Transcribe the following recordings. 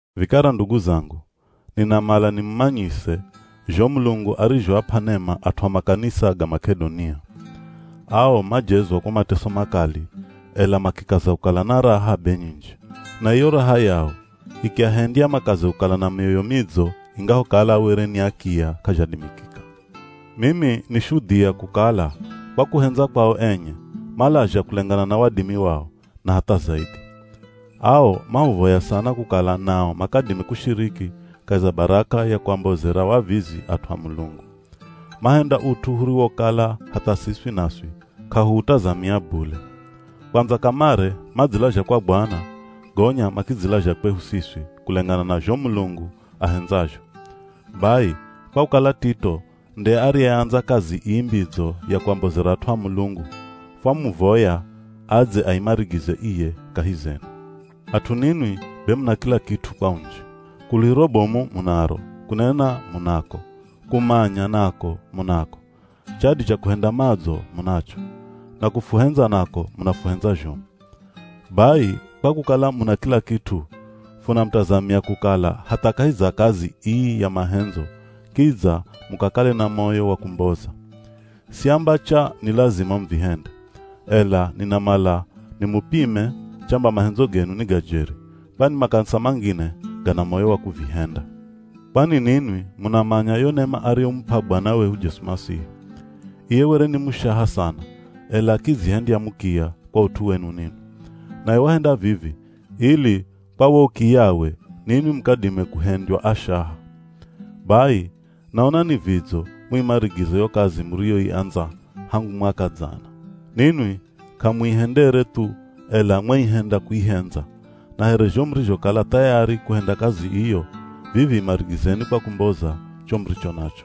Vikara ndugu zangu, ninamala nimumanyise zho Mulungu arizhoap'a nema at'u a makanisa ga Mak'edonia. Ao majezwa kwa mateso makali ela makikaza kukala na raha be nyinji. Na iyo raha yao ikiahendya makaze kukala na mioyo midzo ingahokala were ni akiya k'azhadimikika. Mimi ni shudhia kukala kwa kuhendza kwao enye, malazha kulengana na wadimi wao, na hatha zaidhi. Ao mahuvoya sana kukala nao makadime kushiriki kahi za baraka ya kuambozera wavizi at'u a Mulungu. Mahenda ut'u huriwokala hatha siswi naswi k'ahuutazamia bule. Kwandza kamare madzilazha kwa Bwana, gonya makidzilazha kwehu siswi kulengana na zho Mulungu ahendzazho. Bai, kwa kukala Tito nde ariyeandza kazi ii mbidzo ya kuambozera at'u a Mulungu, fwamuvoya adze aimarigize iye kahi zenu. At'u ninwi be muna kila kit'u kwa unji. Kuluhiro bomu munaro, kunena munako, kumanya nako munako, chadi cha kuhenda madzo munacho, na kufuhendza nako munafuhendza zhomu. Bai, kwa kukala muna kila kit'u, funamutazamia kukala hatha kahi za kazi ii ya mahendzo kidza mukakale na moyo wa kumboza. Siamba cha ni lazima muvihende, ela ninamala nimupime chamba mahendzo genu ni ga jeri, kwani makanisa mangine gana moyo wa kuvihenda. Kwani ninwi munamanya yo nema ariyomup'a Bwana wehu Jesu Masihi. Iye were ni mushaha sana, ela akidzihendya mukiya kwa ut'u wenu ninwi. Naye wahenda vivi ili kwa wo ukiyawe ninwi mukadime kuhendywa ashaha. Bai, naona ni vidzo muimarigize yo kazi muriyoiandza hangu mwaka dzana. Ninwi k'amuihendere thu ela mwaihenda kuihendza. Na here zho murizhokala thayari kuhenda kazi iyo, vivi imarigizeni kwa kumboza cho muricho nacho.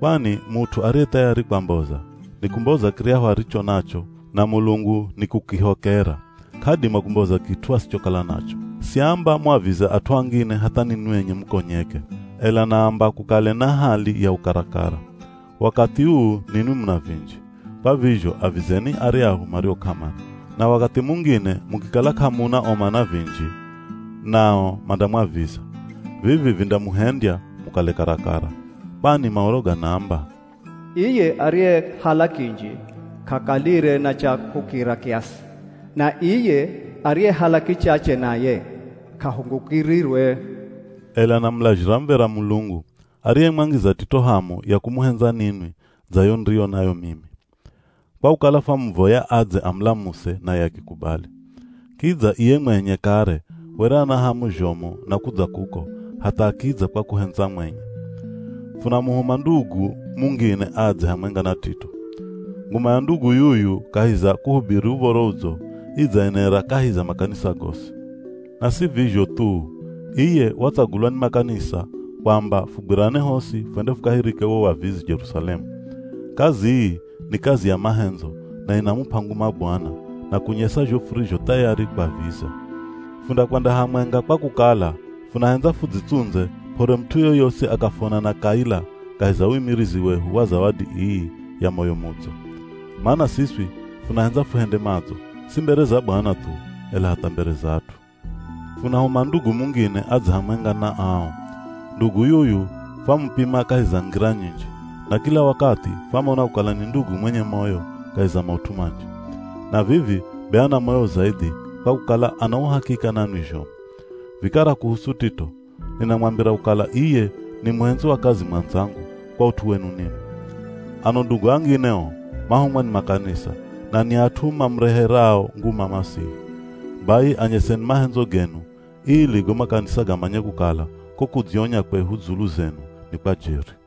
Kwani mut'u ariye thayari kwamboza, nikumboza kiryahu aricho nacho na Mulungu nikukihokera, k'adima kumboza kit'u asichokala nacho. Siamba muavize at'u angine hatha ninwi enye mukonyeke, ela naamba kukale na hali ya ukarakara. Wakathi uu ninwi muna vinji, kwa vizho avizeni aryahu mario k'amana. Na wakathi mungine mukikala k'amuna o mana vinji, nao mandamwaviza. Vivi vindamuhendya mukale karakara. Kwani Maoro ganaamba, “Iye ariyehala kinji k'akalire na cha kukira kiasi. Na iye ariyehala kichache naye k'ahungukirirwe.” Ela namulazhira muv̱era Mulungu, ariyemwangiza Tito hamu ya kumuhendza ninwi dza yo niriyo nayo mimi. Kwa kukala fwamuvoya adze amulamuse naye akikubali. Kidza iye mwenye kare were ana hamu zhomu na kudza kuko hatha akidza kwa kuhendza mwenye. Funamuhuma ndugu mungine adze hamwenga na Tito. Nguma ya ndugu yuyu kahi za kuhubiri Uv̱oro Udzo, idzaenera kahi za makanisa gosi. Na si vizho thuu, iye watsagulwa ni makanisa kwamba fugwirane hosi fwende fukahirike wo wavizi Jerusalemu. Kazi ii ni kazi ya mahendzo na inamup'a nguma Bwana na kunyesa zho furizho thayari kwaviza. Fundakwenda hamwenga kwa kukala funahendza fudzitsundze p'ore mut'u yoyosi akafwona na kaila kahi za uimirizi wehu wa zawadi ii ya moyo mudzo. Mana siswi funahendza fuhende madzo, si mbere za Bwana thu, ela hatha mbere za at'u. Funahuma ndugu mungine adze hamwenga na ao. Ndugu yuyu fwamupima kahi za ngira nyinji, na kila wakathi fwamona kukala ni ndugu mwenye moyo kahi za maut'u manji. Na vivi be ana moyo zaidhi kwa kukala ana uhakika nanwi zhomu. Vikara kuhusu Tito, ninamwambira kukala iye ni muhendzi wa kazi mwandzangu kwa ut'u wenu ninwi. Ano ndugu angine o, mahumwa ni makanisa, na ni at'u mamureherao nguma Masihi. Bai, anyeseni mahendzo genu ili go makanisa gamanye kukala ko kudzionya kwehu dzulu zenu ni kwa jeri.